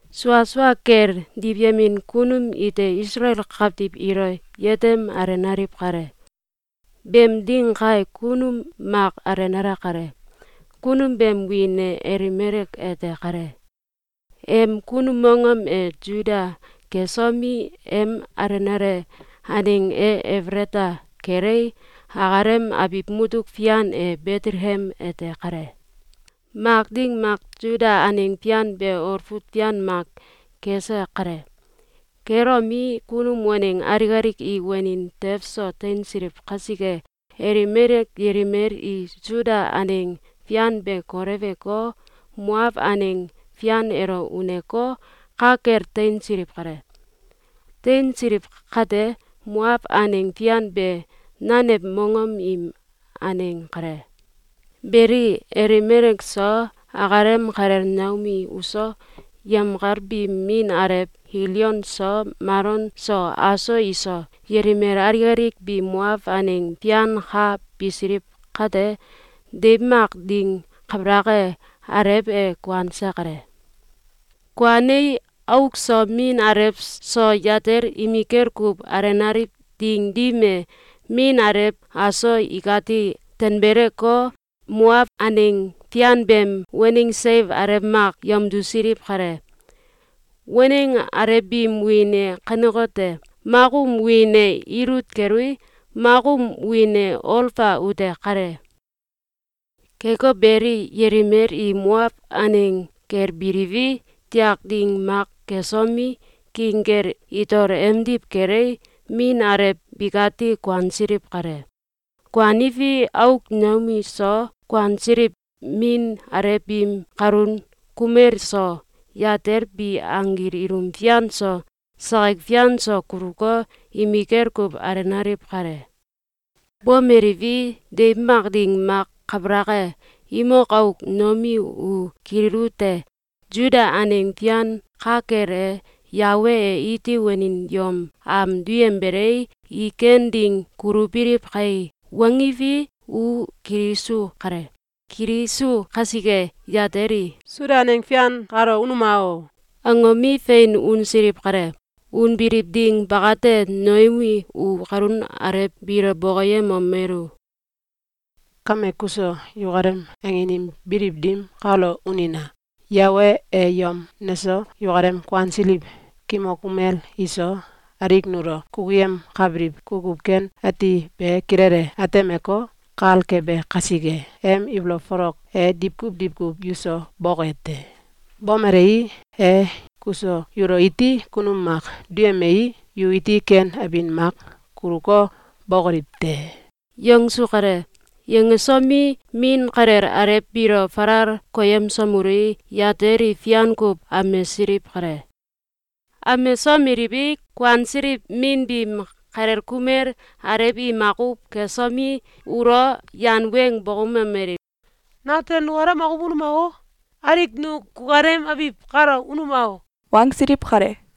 Sua sua kel, diwyemin kunum ite Isalael kawtiw ilo yetem alenaliw kale. Beem ding kae, kunum mak alenale kale. Kunum beem wiin e Elimelek ete kale. Em kunum mongom e Suda kesomi, em alenale aneng e Efelata kelei, akalem abiw mutuk fian e Betelekem ete kale. Mak ding mak, Suda aneng fian be, olfut fian mak kese kale. Kelomi, kunum waneng alik alik i wanin tew so teinsiliw kasike, Elimelek yelimel i Suda aneng fian be koleweko, Moaw aneng fian elo uneko, ka kel teinsiliw kale. Teinsiliw kate, Moaw aneng fian be nanew mongom im aneng kale. Beli, Elimelek so, akalem kalel Noomi uso, yemkal biim min alew Kilyon so Malon so aso iso, yelimel alik alik bi Moaw aneng fian ka bisiliw kate, deiw mak ding kabalak e, alew e kuanse kale. Kuanei, auk so min alew so yatel im imikel kuw alenaliw ding dim e, min alew aso ikati tanbeleko, Moaw aneng fian beem waneng seiw alew mak yamdusiliw kale. Waneng alew biim wiin e kanekote: Mak um wiin e Ilut kelui, mak um wiin e Olfa ute kale. Keko beli, yelimel i Moaw aneng kel biliwi, tiak ding mak kesomi, king kel itol emdiw kelei, min alew bikati kuansiliw kale. Kuaniwi, auk Noomi so, kuansiliw min alew biim kalun kumel so, yatel bi anggil ilum fian so, sakik fian so kuluko, imikel kuw alenaliw kale. Bomeliwi, deiw mak ding mak kabalak e, imok auk Noomi u kililute: “Suda aneng fian ka kel e, Yawe e iti wanin yom am duyembelei, i ken ding kulubiliw kai!”, wangiwi, u kilisu kale. Kilisu kasike, yatel i “Suda aneng fian kalo unuma o!”, angomi, fein unsiliw kale. Unbiliw ding bakate, Noomi u kalun alew biilo bokoyemomelu: “Kame kuso yukalem angin im biliw dim kalo unina! Yawe e yom neso, yukalem kuansiliw kimok kumel iso, alik nulo kukuyemkabiliw kukuw ken ati be kilele atemeko, kal kebe kasike, em ibolow folok e diwkuw diwkuw yuso boke te! Bomelei, e kuso yulo iti kunum mak duyemei, yu iti ken abin mak kuluko, bokoliw te!”, yangsu kale. Yangsomi, min kalel alew biilo falal koyemsomelui, yatel i fian kuw amesiliw kale. Amemsomeliwi, kuansiliw min biim kalel kumel alew i makuw kesomi, ulo yan weng bokoumomeliw: “Natel nukalem makuw unuma! Alik nu kukalem abiw kalo unuma!”, wangsiliw kale.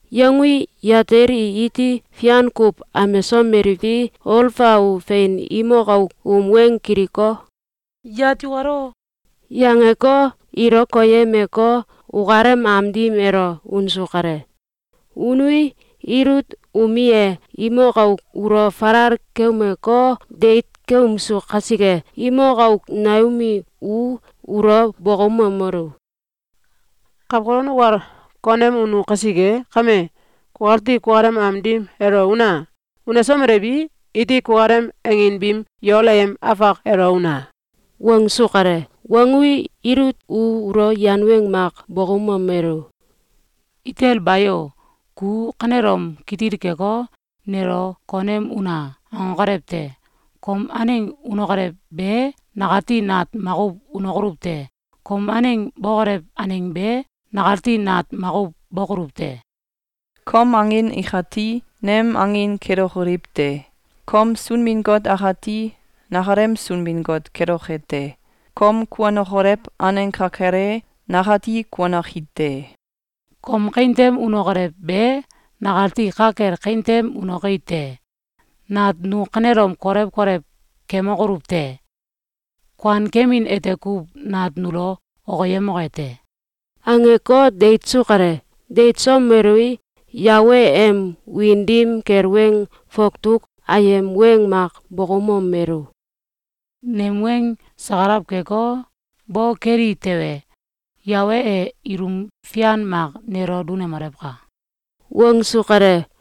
Yangui, yatel i iti fian kuw amesomeliwi, Olfa u fein imok auk um weng kiliko, “Yat yukalo!” yangeko, ilo koyemeko, ukalem am dim elo unsu kale. Unui, Ilut umi e imok auk ulo falal keumeko, deit keumsu kasike, imok auk Noomi u ulo bokoumomelu: “Kawkolon ukal konem unu kasike kame, kukati kukalem am dim elo una! Unesomelewi, iti kukalem angin biim yol ayem afak elo una!”, wangsu kale. Wangui, Ilut u ulo yan weng mak bokoumomelu: “Itel bayo! Ku kanelom kitil keko, nelo ‘Konem una!’, nangokolew te! Kom aneng unokolew be nakati nat makuw unokoluw te. Kom aneng bokolew aneng be, nakati nat makuw bokoluw te. Kom angin ikati nem angin kelokoliw te. Kom Sunbin-Got akati nakalem Sunbin-Got keloke te. Kom kuanokolew aneng ka kel e, nakati kuanoki te. Kom kawin tem unokolew be, nakati ka kel kawin tem unoki te. Nat nu kanelom kolew kolew kemokoluw te! Kuan kemin ete kuw nat nulo okiyemoke te!”, angeko, deitsu kale. Deitsomelui, Yawe em wiin dim kel weng fawtuk ayem weng mak bokoumomelu: “Nem weng sakalaw keko, weng bo bo keli tewe, Yawe e ilum fian mak nelo dunemolewka!”, wangsu kale.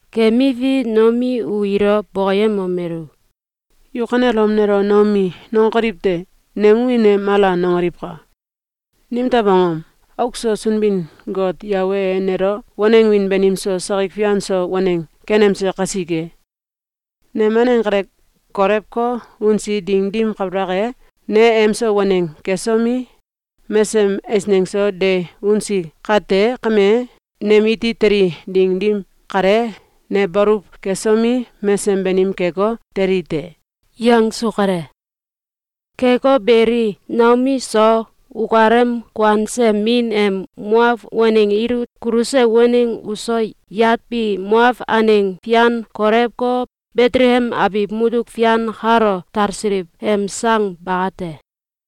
Kemiwi, Noomi u ilo bokoyemomelu: “Yu kanelom nelo Noomi nangokoliw te! Nem wiin e Mala nangoliwka! Nimtew angom? Auk so Sunbin-Got Yawe e nelo waneng wiin banim so sakik fian so waneng kenemse kasike. Nem aneng kale kolewko, unsi ding dim kabalak e, ne emso waneng kesomi, mesesem eisneng so de unsi kate kame, nem iti teli ding dim kale, ne baluw kesomi, mesesem banim keko, teli te.”, yangsu kale. Keko beli, Noomi so, ukalem kuanse min em Moaw waneng Ilut kuluse waneng uso, yat bi Moaw aneng fian kolewko, Betelekem abiw mutuk fian kalo talsiliw em sang bakate.